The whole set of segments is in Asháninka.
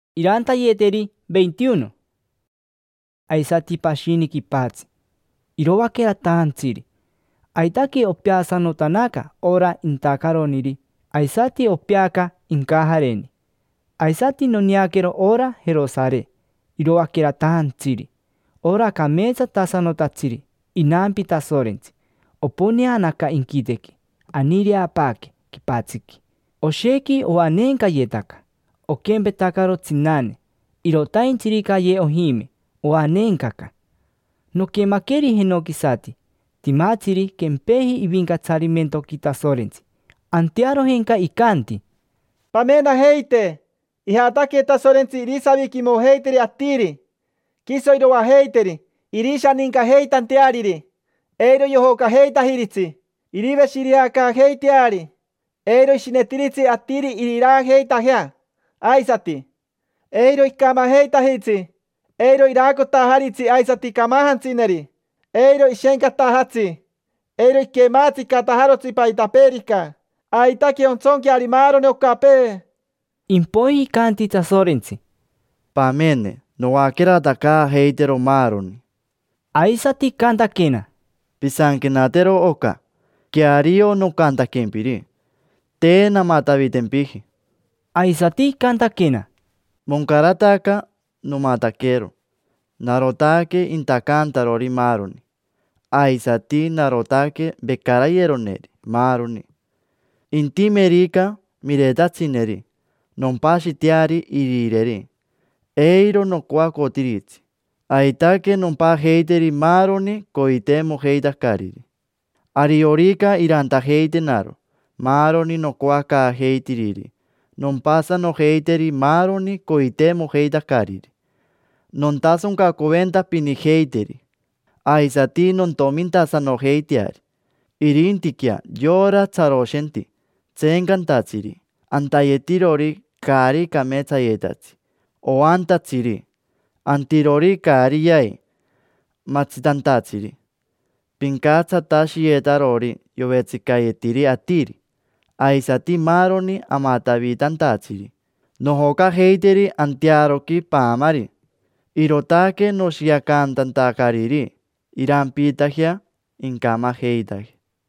Impoiji noneaquero pashini inquite aisati pashini quipatsi, iroaqueratajantsiri. Aitaque opeasanotanaca ora intacaroniri, aisati opeaca incajareni. Aisati noneaquero ora Jerosare iroaqueratajantsiri, ora cameetsatasanotatsiri, inampi Tasorentsi; oponeanaca inquitequi, aniireapaaque quipatsiqui. Oshequi oaneencayetaca, oquempetacaro tsinane, irotaintsirica aye ojime, oaneencaca. Noquemaqueri jenoquisati, timatsiri quempeji ivincatsarimentoqui Tasorentsi. Antearojenca icanti: —Pamenajeite: ijataque Tasorentsi irisaviquimojeiteri atiri. Quiso iroajeiteri, irishanincajeitanteariri. Eiro yojocajeitajiritsi. Iriveshireacaajeiteari, eiro ishinetiritsi atiri iriraajeitajea aisati; eiro icamajeitajitsi. Eiro iraacotajaritsi aisati camajantsineri, eiro ishencatajatsi, eiro iquematsicatajarotsi paitapeerica. Aitaque ontsonqueari maaroni ocapee. Impoiji icanti Tasorentsi: —Pamene, noaqueratacaajeitero maaroni. Aisati icantaquena: —Pisanquenatero oca: queario nocantaquempiri, te namatavitempiji. Aisati icantaquena: —Moncarataca, nomataquero. Narotaque intacantarori maaroni, aisati narotaque vecarayeroneri maaroni. Intimerica miretatsineri, nompashiteari irireri; eiro nocoacotiritsi: aitaque nompajeiteri maaroni coiteimojeitacariri. Ariorica irantajeitenaro maaroni nocoacaajeitiriri, nompasanojeiteri maaroni coiteimojeitacariri. Nontasoncacoventapinijeiteri, aisati nontomintasanojeiteari. Irintiquea yora tsaroshenti, tseencantatsiri, antayetirori caari cameetsayetatsi, oantatsiri, antirori caari yai, matsitantatsiri, pincatsatashiyetarori yovetsicayetiri atiri, aisati maaroni amatavitantatsiri, nojocajeiteri antearoqui paamari. Irootaque noshiacantantacariri irampiitajea incamajeitaje.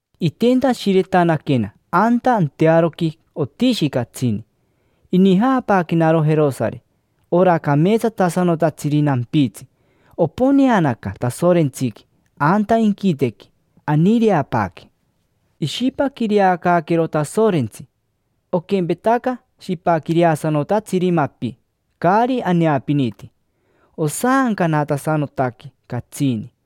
Itentashiretanaquena anta antearoqui otishi catsini, inijaapaaquenaro Jerosare: ora cameetsatasanotatsiri nampitsi. Oponeanaca Tasorentsiqui anta inquitequi, aniireapaaque. Ishipaquireacaaquero Tasorentsi, oquempetaca shipaquireasanotatsiri mapi caari aneapiniti, osaancanatasanotaque catsini.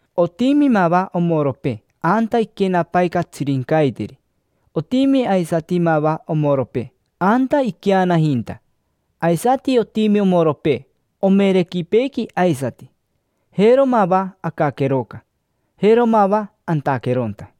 Otimi mava omoropee anta iquenapai catsirincaiteri, otimi aisati mava omoropee anta iqueanajinta, aisati otimi omoropee omerequipeequi aisati: jero mava acaqueroca, jero mava antaqueronta.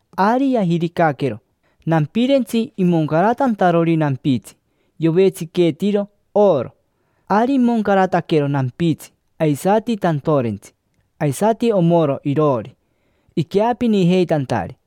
Ari yajiricaquero nampirentsi imoncaratantarori nampitsi, yovetsiqueetiro oro. Ari imoncarataquero nampitsi aisati tantorentsi, aisati omoro iroori, iqueapinijeitantari.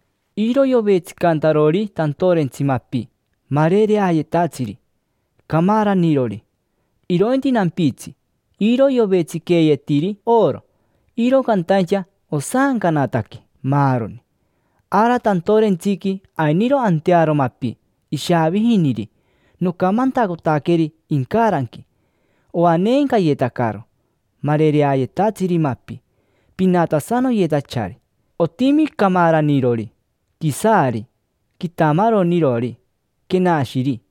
Iro yovetsicantarori tantorentsi mapi marereayetatsiri, camaranirori. Irointi nampitsi, iro yovetsiqueeyetiri oro, iro cantaincha osaancanataque, maaroni. Ara tantorentsiqui ainiro antearo mapi ishaavijiniri nocamantacotaqueri incaranqui. Oaneencayetacaro marereayetatsiri mapi, pinatasanoyetachari: otimi camaranirori, quisaari, quitamaronirori, quenashiri,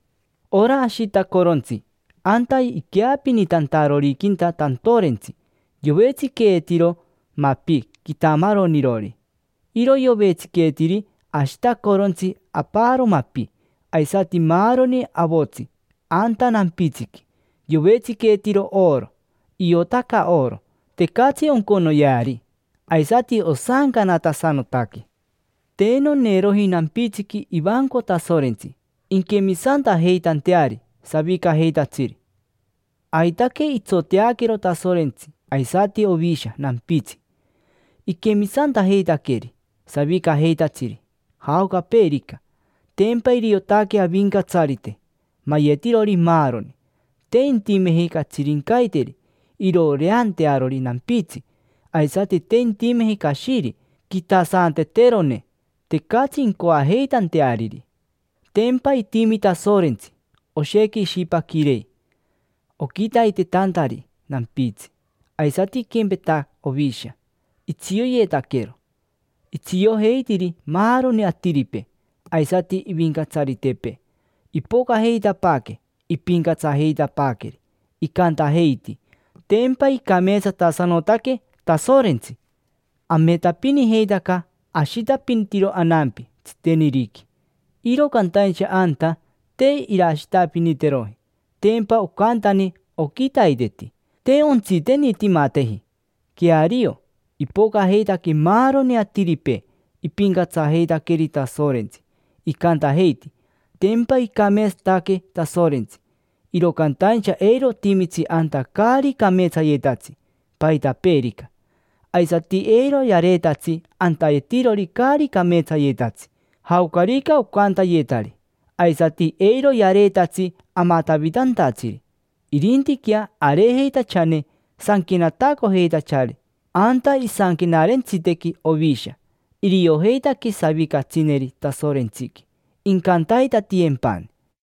Ora ashitacorontsi anta iqueapinitantaroriquinta tantorentsi yovetsiqueeyetiro mapi quitamaronirori. Iro yovetsiqueetiri ashitacorontsi aparo mapi. Aisati maaroni avotsi anta nampitsiqui yovetsiqueetiro oro, iotaca oro, tecatsi onconoyeari; aisati osaancanatasanotaque. Te noneeroji nampitsiqui ivanco Tasorentsi inquemisantajeitanteari savicajeitatsiri. Aitaque itsoteaquero Tasorentsi aisati Ovisha nampitsi, iquemisantajeitaqueri savicajeitatsiri jaocapeerica. Tempa iriotaque Avincatsarite mayetirori maaroni. Te intimeji catsirincaiteri irooreantearori nampitsi, aisati te intemeji cashiri quitasanteterone: tecatsi incoajeitanteariri. Tempa itimi Tasorentsi, oshequi ishipaquirei oquitaitetantari nampitsi. Aisati iquempeta Ovisha, itsioyetaquero. Itsiojeitiri maaroni atiripee; aisati ivincatsaritepee, ipocajeitapaaque, ipincatsajeitapaaqueri, icantajeiti: “Tempa icameetsatasanotaque Tasorentsi”. Ametapinijeitaca ashitapinitiro anampi tsiteniriqui, iro cantaincha anta te irashitapiniteroji: tempa ocantani oquitaiteti, te ontsitenitimateji. Queario, ipocajeitaque maaroni atiripee ipincatsajeitaqueri Tasorentsi, icantajeiti: “Tempa icameetsataque Tasorentsi”. Iro cantaincha eiro otimitsi anta caari cameetsayetatsi, paitapeerica. Aisati eiro yareetatsi antayetirori caari cameetsayetatsi, jaocarica ocantayetari; aisati eiro yareetatsi amatavitantatsiri. Irintiquea areejeitachane sanquenatacojeitachari anta isanquenarentsitequi Ovisha. Iriojeitaque savicatsineri Tasorentsiqui, incantaitatiyempani.